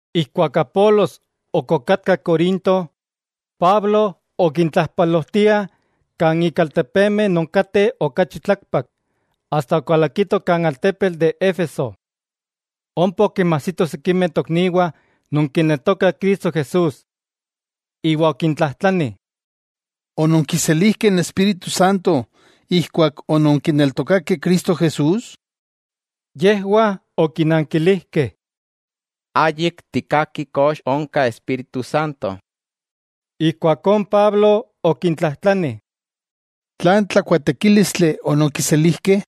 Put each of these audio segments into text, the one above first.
Ijkuak Apolos ok okatka Corinto, Pablo okintlajpalojtiah kan ik altepemeh non kateh okachi tlakpak, asta okalakito kan altepetl de Éfeso. Ompa okinmajsito sikimeh tokniwah non kineltokah Cristo Jesús. Iwa okintlajtlani: —¿Ononkiselijkeh n Espíritu Santo ijkuak ononkineltokakeh Cristo Jesús? Yejwah okinankilijkeh: —Ayik tikkaki kox onka Espíritu Santo. Ijkuakó n Pablo okintlajtlani: —¿Tlan tlakuaatekílistli ononkiselijkeh?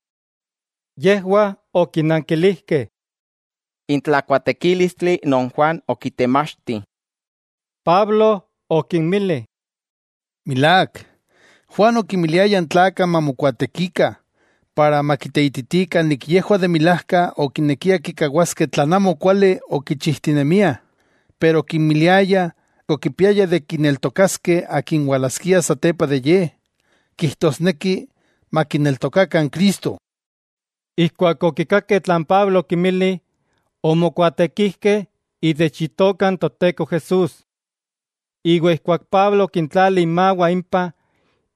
Yejwah okinankilijkeh: —N tlakuaatekílistli non Juan okitemachti. Pablo okinmili: —Milák, Juan okinmiliaya n tlakah mamokuaatekikah iwa makiteititikah yejwah de milajka okinekiah kikawaskeh tlan amo kuali okichijtinemiah, pero okimiliaya omonekiah kineltokaskeh akin walaskia satepa de ye, kijtosneki makineltokakah n Cristo. Ijkuak okikakeh tlan Pablo okinmili, omokuaatekijkeh itech Itoka n Toteko Jesús. Iwa ijkuak Pablo okintlali imawah impah,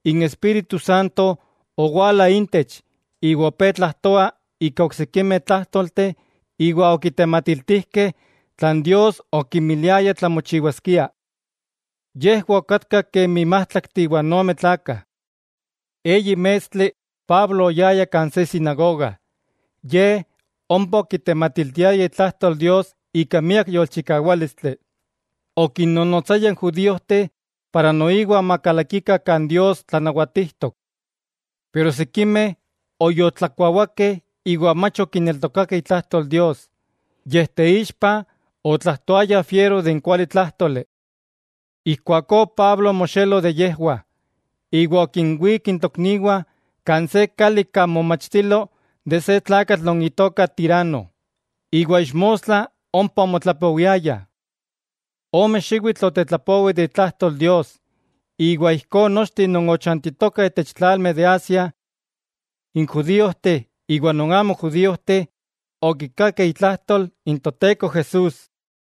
n Espíritu Santo owala intech iwa opé tlajtoah ika oksikimeh tlájtolteh iwa okitematiltijkeh tlan Dios okimiliaya tlamochiwaskia. Yejwah okatkah kemi májtlaktli iwa n ome tlakah. Eyi mestli Pablo oyaya kan se sinagoga. Ye ompa okitematiltiaya itlajtol Dios ika miak yolchikawálistli. Okinnonotsaya n judíojteh noiwa makalakikah kan Dios tlanawatijtok. Pero sikimeh oyoltlakuawakeh iwa mach okineltokakeh itlajtol Dios, yej teixpa otlajtoayah fiero de n kualitlájtoli. Ijkuakó Pablo omoxelo de yejwah, iwa okinwík n tokniwah kan se kali kan momachtilo de se tlakatl non itoka Tirano, iwa ixmostla ompa omotlapowiayah. Ome xiwitl otetlapowi de itlajtol Dios, iwa ijkó nochteh non ochantitokah itech tlalmeh de Asia, n judíojteh iwa non amo judíojteh okikakeh itlajtol n Toteko Jesús.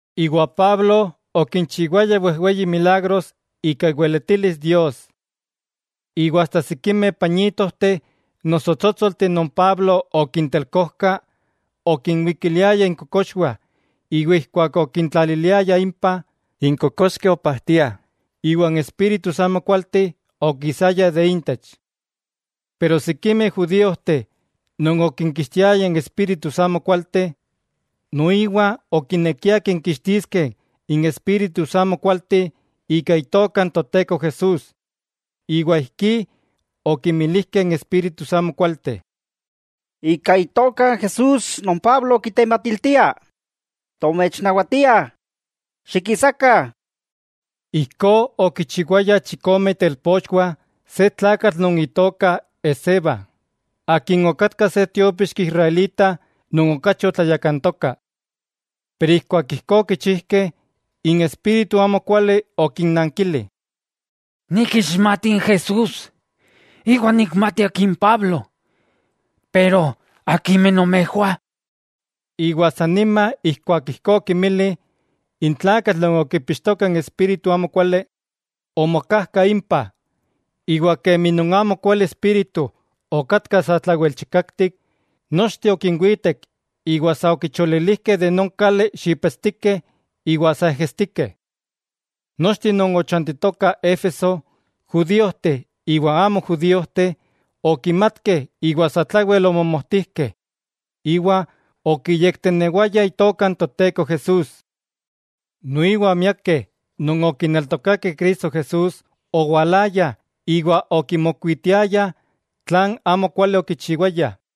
Iwa Pablo okinchiwaya wejweyih milagros ika iweletilis Dios. Iwa asta sikimeh pañitojteh noso tsótsolteh non Pablo okintelkojka, okinwikiliayah inkokoxwah, iwa ijkuak okintlaliliayah impah, n kokoxkeh opajtiah iwa n espíritus amokualteh okisayah de intech. Pero sikimeh judíojteh non okinkixtiayah espíritus amokualteh, noiwa okinekiah kinkixtiskeh n espíritus amokualteh ika Itoka n Toteko Jesús, iwa ijkí okimilijkeh n espíritus amokualteh: —¡Ika Itoka n Jesús non Pablo kitematiltia tomechnawatiah, xikisakah! Ijkó okichiwayah chikome itelpochwah se tlakatl non itoka Esceva, akin okatka se tiópixki israelita non okachi otlayakantoka. Pero ijkuak ijkó okichijkeh, n espíritu amokuali okinnankili: —Nikixmati n Jesús, iwa nikmati akin Pablo; ¿pero akimeh nomejwah? Iwa san nima ijkuak ijkó okinmili, n tlakatl non okipixtoka n espíritu amokuali omokajka impah, iwa kemi non amokuali espíritu okatka satlawel chikaktik, nochteh okinwitek iwa sa okicholilijkeh de non kali xipetstikeh iwa sa ejestikeh. Nochteh non ochantitokah Éfeso, judíojteh iwa amo judíojteh, okimatkeh iwa satlawel omomojtijkeh, iwa okiyektenewayah Itoka n Toteko Jesús. Noiwa miakeh non okineltokakeh Cristo Jesús owalayah iwa okimokuitiayah tlan amokuali okichiwayah.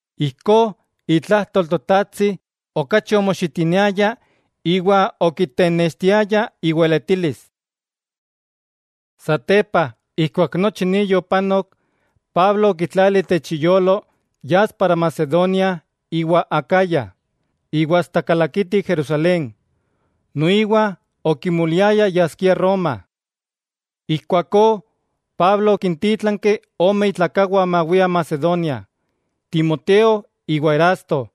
Ijkó itlajtol Totajtsi okachi omoxitiniaya iwa okitenextiaya iweletilis. Satepa ijkuak nochi ni yopanok, Pablo okitlali itech iyolo yas para Macedonia iwa Acaya iwa asta kalakiti Jerusalén. Noiwa okimoliaya yaskia Roma. Ijkuakó Pablo okintítlanki ome itlakawah mawiah Macedonia, Timoteo iwa Erasto,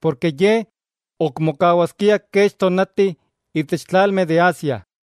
porke ye ok mokawaskia kech tonati itech tlalmeh de Asia.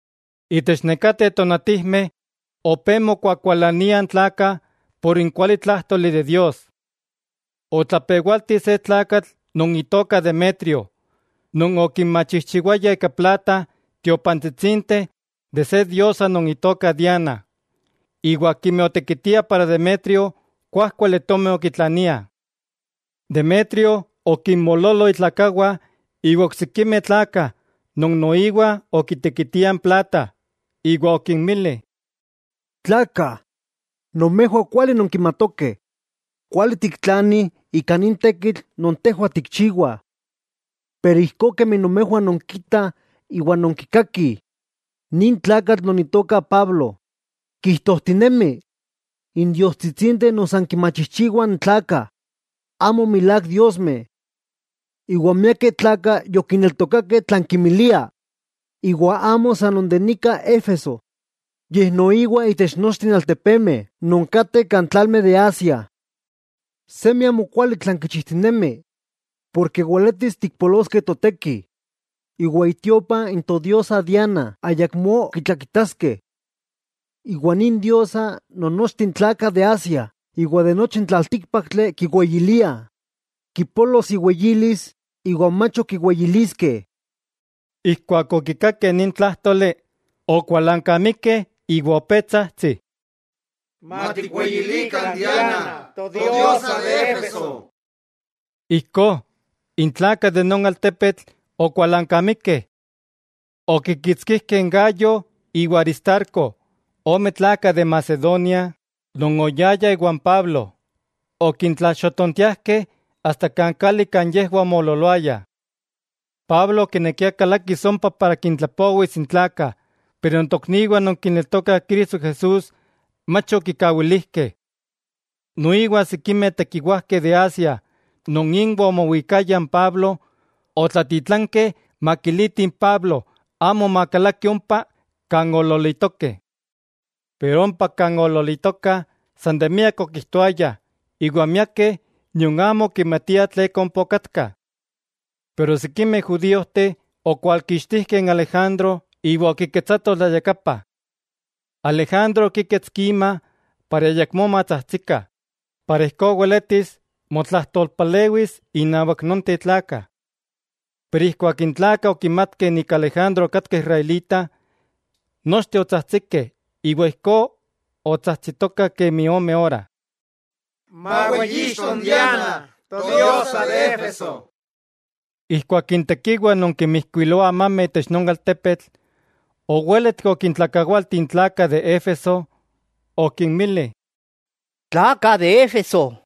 Itech nekateh tonatijmeh opé mokuakualaniah n tlakah por n kualitlájtoli de Dios. Otlapewalti se tlakatl non itoka Demetrio, non okinmachijchiwaya ika plata tiopantsitsinteh de se diosa non itoka Diana, iwa akimeh otekitiah para Demetrio kuájkuali tomi okitlaniah. Demetrio okinmoololo itlakawah iwa oksikimeh tlakah non noiwa okitekitiah n plata, iwa okinmili: —Tlakah, nomejwah kuali nonkimatokeh kuali tiktlanih ika nin tekitl non tejwah tikchiwah. Pero ijkó kemi nomejwah nonkitah iwa nonkikakih, nin tlakatl non itoka Pablo kijtojtinemi n diostsitsinteh non san kinmachijchiwah n tlakah, amo milák diosmeh. Iwa miakeh tlakah yokineltokakeh tlan kimilia, iwa amo san non de nika Éfeso, yej noiwa itech nochteh altepemeh non kateh kan tlalmeh de Asia. Semi amokuali tlan kichijtinemi, porke weletis tikpoloskeh toteki iwa itiopa n todiosa Diana ayakmó ok kitlakitaskeh. Iwa nin diosa non nochteh n tlakah de Asia iwa de nochi n tlaltíkpaktli kiweyiliah, kipolos iweyilis iwa mach ok kiweyiliskeh. Ijkuak okikakeh nin tlájtoli, okualankamikeh iwa opé tsajtsih: —¡Matikweyilikah n Diana, todiosa de Éfeso! Ijkó, n tlakah de non altepetl okualankamikeh. Okikitskijkeh n Gayo iwa Aristarco, ome tlakah de Macedonia non oyayah iwan Pablo, okintlalxotontiajkeh asta kan kali kan yejwah omoololoayah. Pablo okinekia kalakis ompa para kintlapowis n tlakah, pero n tokniwah non kineltokah Cristo Jesús mach okikawilijkeh. Noiwa sikimeh tekiwajkeh de Asia non inwah omowikaya n Pablo, otlatitlankeh makilitih n Pablo amo makalaki ompa kan oololitokeh. Pero ompa kan oololitokah, san de miak okijtoayah, iwa miakeh nion amo okimatiah tleka ompa okatkah. Pero sikimeh judíojteh okwalkixtijkeh n Alejandro iwa okiketsatoh tlayakapa. Alejandro okíketski ima para ayakmó matsajtsikah, iwa ijkó weletis motlajtolpalewis inawak nonteh tlakah. Pero ijkuak n tlakah okimatkeh Alejandro okatka israelita, nochteh otsajtsikeh iwa ijkó otsajtsitokah kemi ome ora: —¡Maweyixto n Diana, todiosa de Éfeso! Ijkuak n tekiwa non kinmijkuiloa amameh itech non altepetl owéletki okintlakawalti n tlakah de Éfeso, okinmili: —Tlakah de Éfeso,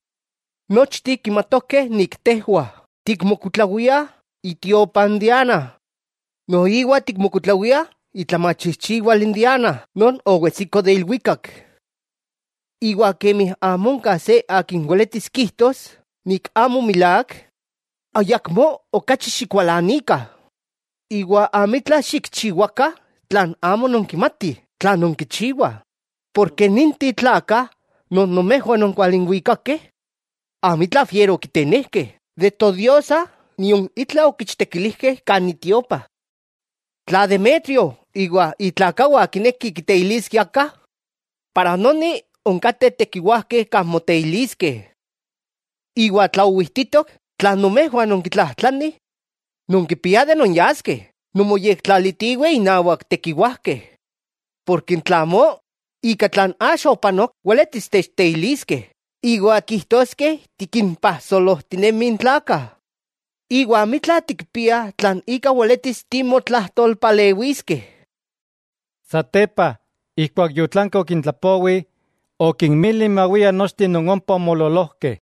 nochteh kimatokeh tejwah tikmokuitlawiah itiopa n Diana noiwa tikmokuitlawiah itlamachijchiwal Diana non owetsiko de ilwikak. Iwa kemi amo onka se akin weletis kijtos amo milák, ayakmó okachi xikualanikah iwa amitla xikchiwakah tla amo nonkimatih tlan nonkichiwah. Porke ninteh tlakah non nomejwah ononkualinwikakeh, amitla fiero okitenejkeh de todiosa nion itla okichtekilijkeh kan itiopa. Tla Demetrio iwa itlakawah kinekih kiteiliskeh aka, yika onkateh tekiwajkeh kan moteiliskeh. Iwa tla owijtitok tlan nomejwah nonkitlajtlanih, nonkipiah de nonyaskeh nonmoyektlalitiweh innawak tekiwajkeh. Porke tla amó, ika tlan axa opanok weletis techteiliskeh iwa kijtoskeh tikimpajsolojtinemih n tlakah; iwa amitla tikpiah tlan ika weletis timotlajtolpalewiskeh. Satepa, ijkuak yotlanki okintlapowi, okinmili mawiah nochteh non ompa omoololojkeh.